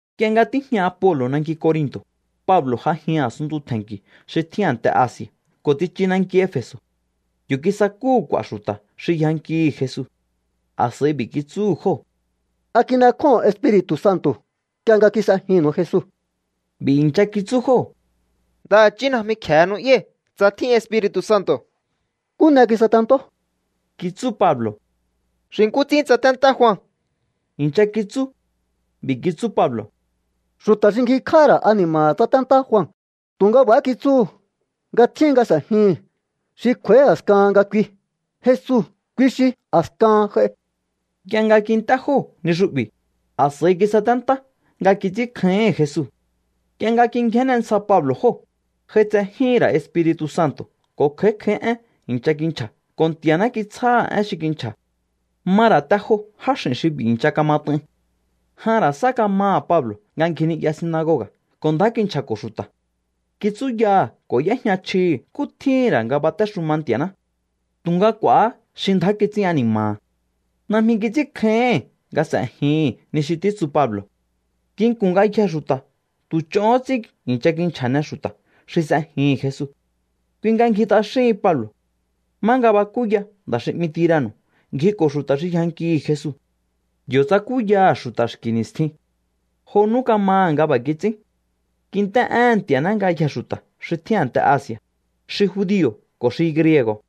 Nk'ie nga tíjña Apolo̱ nanki Corinto̱, Pablo̱ j'ajin a̱sunntu tje̱nki̱ xi tjín a̱nte Asi̱a̱ ko̱ tsichu nanki Efe̱so̱. Yo̱ kisakúhu̱ k'u̱a̱ xu̱ta̱ xi yjankihi̱ Jesu. A̱s'a̱i b'i̱ kitsúhu̱ jóo̱: —¿A kin'ekjóho̱on Espiri̱tu̱ Santo̱ nk'ie nga kis'ejinnu̱u Jesu? B'i̱ i̱ncha kitsú jóo̱: —Ndaha̱chí najmi kje̱e nu'yái̱ tsa tjín Espiri̱tu̱ Santo̱. —¿Nkú n'e kisatentó? —kitsú Pablo̱. —Xi nkú ts'ín tsaténtá Jua —i̱ncha kitsú. B'i̱ kitsú Pablo̱: —Xu̱ta̱ xi ngjikj'áha̱ ra̱ ani̱ma̱ha̱ tsaténtá Jua, tu̱nga b'a̱há kitsúhu̱ nga tjíhin nga s'e̱jihi̱n xi kj'u̱a̱í a̱skahan nga kui. Jesu, kui xi a̱skahan j'ai. Nk'ie nga kint'é jóo̱ ni xu'bi̱, a̱s'a̱i kisaténtá nga kits'ínkjáíhi̱n Jesu. Nk'ie nga kingjénne ntsja Pablo̱ jóo̱, j'aitsejíhi̱n ra̱ Espiri̱tu̱ Santo̱ ko̱ kj'a̱í kj'a̱í éhen i̱ncha kinchja̱ ko̱ Nti̱a̱ná kitsjáha̱ én xi kinchja̱. Ma ra̱ te jo jáx'i̱n xi b'i̱ i̱ncha kamat'ain. Jan ra̱ sá kamaha̱ Pablo̱ nga ngji ni'ya sinagoga̱ ko̱ ndjá kinchja̱ko̱ xu̱ta̱. Kitsúyaha̱ ko̱ y'éjña chjihi̱ nkú tjíhi̱n ra̱ nga batéxuma Nti̱a̱ná. Tu̱nga k'u̱a̱há xi ndjá kits'ín ani̱ma̱ha̱. Najmi kits'ínkjáíhi̱n nga s'e̱jihi̱n ni xi títsu Pablo̱. Nginku̱n ngayjee̱ xu̱ta̱ tu̱ ch'ohón ts'ín i̱ncha kinchja̱ne xu̱ta̱ xi s'ejihi̱n Jesu. Kui nga ngji t'axíhin Pablo̱. Má nga bakúya nda̱ xi 'mi Tirano̱ ngjiko̱ xu̱ta̱ xi yjankihi̱ Jesu. Yo̱ tsakúyaha̱ xu̱ta̱ xki̱ ni̱stjin. Jo nú kamaha̱ nga b'a̱ kits'ín. Kint'é éhe̱n Nti̱a̱ná ngayjee̱ xu̱ta̱ xi tjín a̱nte Asi̱a̱, xi judio̱ ko̱ xi griego̱.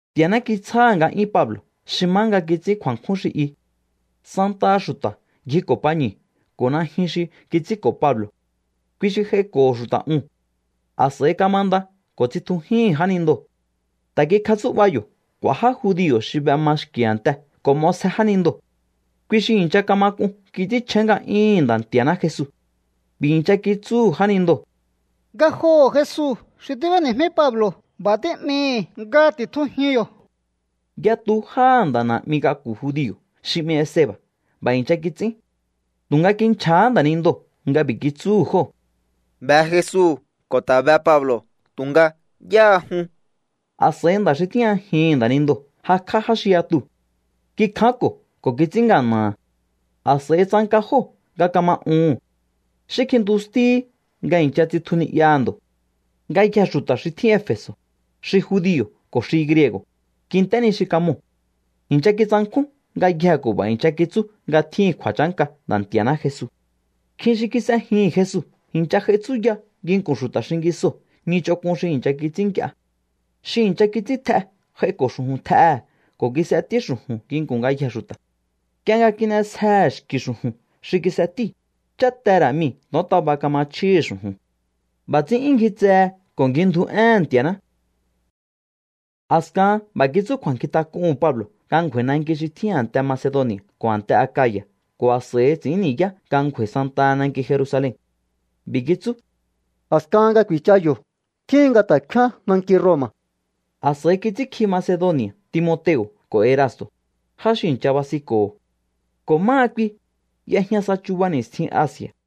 Nti̱a̱ná kitsjáha̱ nga'yún Pablo̱ xi má nga kits'ín kju̱a̱nkjún xi i. Santaha xu̱ta̱ ngjiko̱ pañu̱ ko̱ najyun xi kits'ínko̱ Pablo̱. Kui xi j'aiko̱ho̱ xu̱ta̱ uhu̱n. A̱s'a̱i kamanda ko̱ tsitjujíhi̱n jánindoo̱. Ta̱ kikjatsú'ba̱ yo̱ k'u̱a̱ já judio̱ xi b'ema xki̱ a̱nte ko̱ m'osje jánindoo̱. Kui xi i̱ncha kama k'un kits'ínchjén nga'yúhu̱n Nda̱ Nti̱a̱ná Jesu. B'i̱ i̱ncha kitsúhu̱ jánindoo̱: —Ngajoho̱ Jesu xi tíb'éni̱jmí Pablo̱ b'a̱ tí'mii̱hi̱ nga ti̱tjujiun yo̱. Yatu jáha̱ nda̱ na̱'mi k'aku̱ judio̱ xi 'mi Esceba̱ b'a̱ i̱ncha kits'ín. Tu̱nga kinchja̱há nda̱nindoo̱ nga b'i̱ kitsúhu̱ jóo̱: —Be Jesu ko̱ ta̱ be Pablo̱, tu̱nga, ¿yáha jun? A̱s'a̱i nda̱ xi tíjñajihi̱n nda̱nindoo̱ jakj'á já xi yatuu̱. Kikjánko̱ ko̱ kits'ín ngana̱ha̱. A̱s'a̱i tsanka jóo̱ nga kama uhu̱n. Xí kjintustíhí nga i̱ncha tsitju ni'yaha̱ ndo̱. Ngayjee̱ xu̱ta̱ xi tjín Efe̱so̱, xi judio̱ ko̱ xi griego̱, kint'é ni xi kamoo̱. I̱ncha kitsankjún ngayjee̱ ko̱ b'a̱ i̱ncha kitsú nga tjíhi̱n kju̱a̱chánka Nda̱ Nti̱a̱ná Jesu. Nkjin xi kis'ejihi̱n Jesu i̱ncha j'ai tsúya nginku̱n xu̱ta̱ xingisoo̱ ni ch'onk'un xi i̱ncha kits'ín nk'ie. Xi i̱ncha kits'ín tj'e j'aiko̱ xu̱ju̱n tj'ehe̱ ko̱ kis'etí xu̱ju̱n nginku̱n ngayjee̱ xu̱ta̱. Nk'ie nga kin'esjehe̱ xki̱ xu̱ju̱n xi kis'etíu̱, cháte ra̱ mii̱ to̱ontaba kama chjíhi̱ xu̱ju̱n. B'a̱ ts'ín 'yún ngji tse ko̱ ngji ndju éhe̱n Nti̱a̱ná. A̱skahan b'a̱ kitsú kju̱a̱nkjintak'uhu̱n Pablo̱ nga ngju̱a̱i̱ nanki xi tjín a̱nte Macedoni̱a̱ ko̱ a̱nte Akaya̱ ko̱ a̱s'a̱i ts'i̱ín ni̱yá nga ngju̱a̱i̱ santaha nanki Jerusalen. B'i̱ kitsú: —A̱skahan nga ku̱i̱cha yo̱, tjíhin nga ta̱ kfíán nanki Roma̱. A̱s'a̱i kits'ínkji Macedoni̱a̱ Timoteo̱ ko̱ Erasto̱, já xi i̱ncha basinko̱ho̱. Ko̱ máha kui, y'ejña sa chuba ni̱stjin Asi̱a̱.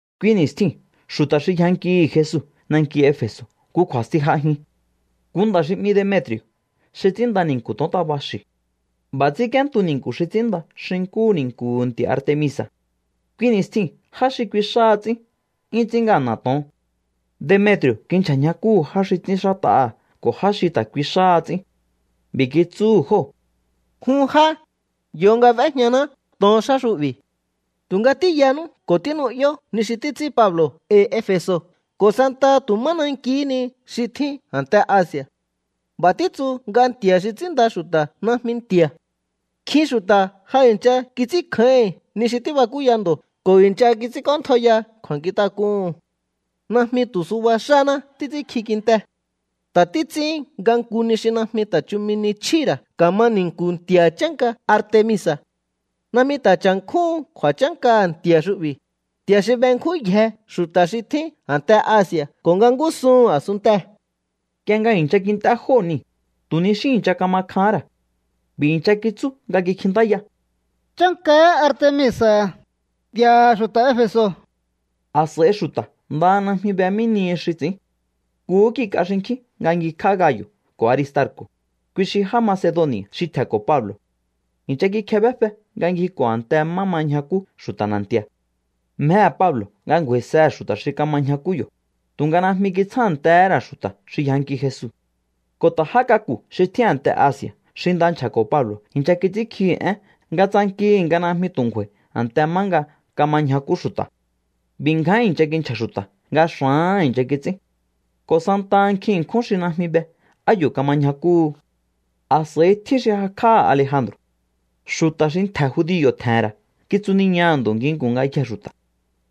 Kui ni̱stjiu̱n xu̱ta̱ xi yjankihi̱ Jesu nanki Efe̱so̱ nku kju̱a̱sti j'ajin. Nku nda̱ xi 'mi Demetri̱o̱ xi ts'ínnda ni̱nku̱ to̱ontaba xi̱. B'a̱ ts'ínk'íéntu ni̱nku̱ xi ts'ínnda xi nkúhu ni̱nku̱hu̱ nti̱a̱ Artemisa̱. Kui ni̱stjiu̱n já xi kui xáha ts'ín 'yún ts'ín ngana̱ to̱on. Demetri̱o̱ kinchja̱ ñjakúhu̱ já xi ts'ínxát'aha̱ ko̱ já xi ta̱ kui xáha ts'ín. B'i̱ kitsúhu̱ jóo̱: —Jun já, yo nga b'éjñaná to̱on xá xu'bi̱. Tu̱nga tíyanú ko̱ tínu'yó ni xi títs'ín Pablo̱ e̱i̱ Efe̱so̱ ko̱ santaha tu̱ má nankihí ni xi tjín a̱nte Asi̱a̱. B'a̱ títsu nga nti̱a̱ xi ts'ínnda xu̱ta̱ najmi nti̱a̱. Nkjin xu̱ta̱ ja i̱ncha kits'ínkjáíhi̱n ni xi tíbakúya ndo̱ ko̱ i̱ncha kits'ínk'óntjaiya kju̱a̱nkjintak'uhu̱n. Najmi tu̱ suba xáná títs'ínkji kinte. Ta̱ títs'ín nga nku ni xi najmi ta̱ chumi ni chjíhi̱ ra̱ ka̱ma ni̱nku̱hu̱ nti̱a̱ chánka Artemisa̱. Najmi ta̱ cha̱nkjúhun kju̱a̱chánkaha̱ nti̱a̱ xu'bi̱, nti̱a̱ xi benkjúnyje xu̱ta̱ xi tjín a̱nte Asi̱a̱ ko̱ nga ngúsuhu̱n a̱sunntee̱. Nk'ie nga i̱ncha kint'é jóo̱ niu̱, tu̱ xí i̱ncha kama kjahán ra̱. B'i̱ i̱ncha kitsú nga kikjintáya: —¡Chánkahá Artemisa̱, nti̱a̱ha̱ xu̱ta̱ Efe̱so̱! A̱s'a̱i xu̱ta̱ ndaha najmi be mí nihi xi ts'i̱ín. Nkuhú kik'a xinkjín nga ngjikj'á Gayo̱ ko̱ Aristarko̱, kui xi já Macedoni̱a̱ xi tje̱nko̱ Pablo̱. I̱ncha kikjebéfe nga ngjiko̱ a̱nte má ma ñjakú xu̱ta̱ na̱nti̱a̱. Mjehe̱ Pablo̱ nga ngju̱a̱i̱sehe̱ xu̱ta̱ xi kama ñjakú yo̱, tu̱nga najmi kitsjántehé ra̱ xu̱ta̱ xi yjanki Jesu. Ko̱ ta̱ já k'aku̱ xi tjín a̱nte Asi̱a̱ xi nda nchja̱ko̱ Pablo̱ i̱ncha kits'ínkjihi̱ én nga tsankihi̱ nga najmi tu̱ ngju̱a̱i̱ a̱nte má nga kama ñjakú xu̱ta̱. B'i̱ ngján i̱ncha kinchja̱ xu̱ta̱ nga xa̱áha̱n i̱ncha kits'ín. Ko̱ santaha nkjin ṉkjún xi najmi be á yo̱ kama ñjakúhu. A̱s'a̱i tjín xi jakj'áha̱ Alejandro̱. Xu̱ta̱ xi ntje̱ judio̱ tje̱he̱n ra̱ kitsuniñaha̱ ndo̱ nginku̱n ngayjee̱ xu̱ta̱.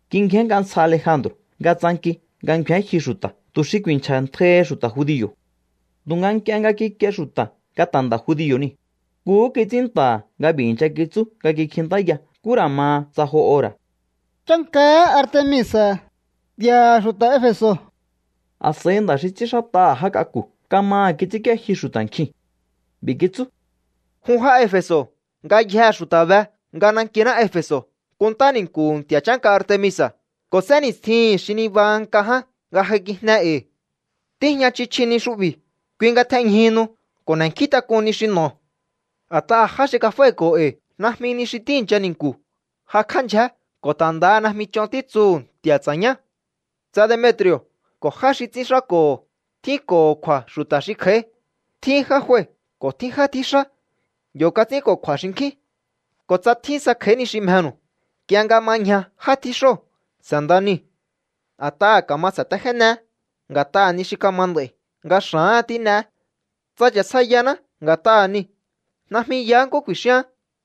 Kingjén nk'a ntsja Alejandro̱ nga tsanki nga ngju̱én jyu xu̱ta̱ tu̱ xi ku̱i̱nchja̱ntjaihi xu̱ta̱ judio̱. Tu̱nga nk'ie nga kikie xu̱ta̱ nga ta̱ nda̱ judio̱ niu̱, nkuhú kits'ín nta̱ha̱ nga b'i̱ i̱ncha kitsú nga kikjintáya nkú ra̱ ma tsa jo ora̱: —¡Chánkahá Artemisa̱, nti̱a̱ha̱ xu̱ta̱ Efe̱so̱! A̱s'a̱i nda̱ xi ts'ínxát'aha̱ já k'aku̱ kamaha̱ kits'ínk'íéjyu xu̱ta̱ nkjiu̱n. B'i̱ kitsú: —Jun já Efe̱so̱, ngayjee̱ xu̱ta̱ be nga nankiná Efe̱so̱ kunntá ni̱nku̱hu̱ nti̱a̱ chánka Artemisa̱ ko̱ sénni̱stjihi̱n xi nibaha nk'a ján nga j'aikijne e̱i̱. Tíjña chji chji ni xu'bi̱. Kui nga tjenjyúhunu ko̱ n'e̱nkjíntak'un ni xi n'o̱o. A̱t'aha̱ já xi kaf'ái̱ko̱o e̱i̱ najmi ni xi tíi̱ncha ni̱nku̱ jakj'á ndyjé ko̱ ta̱ ndaha najmi ch'on títsuhu̱ nti̱a̱ ts'a̱ñá. ’Tsa Demetri̱o̱ ko̱ já xi ts'ínxáko̱ tjínko̱ho̱ kju̱a̱ xu̱ta̱ xi kj'a̱í, tjín já jue ko̱ tjín já tjíxá. Yo̱ kats'ínko̱kju̱a̱ xinkjín. Ko̱ tsa tjín sa kj'a̱í ni xi mjenu̱u, nk'ie nga ma ñja já tjíxóo̱ s'e̱nda niu̱. A̱t'aha̱ ka̱ma sa̱téjéneé nga̱t'aha̱ ni xi kama nd'a̱i̱, nga xa̱áha̱n tín'eé. Tsa cha̱sjaiyaná nga̱t'aha̱ niu̱, najmi yaá nkú ku̱i̱xíaán.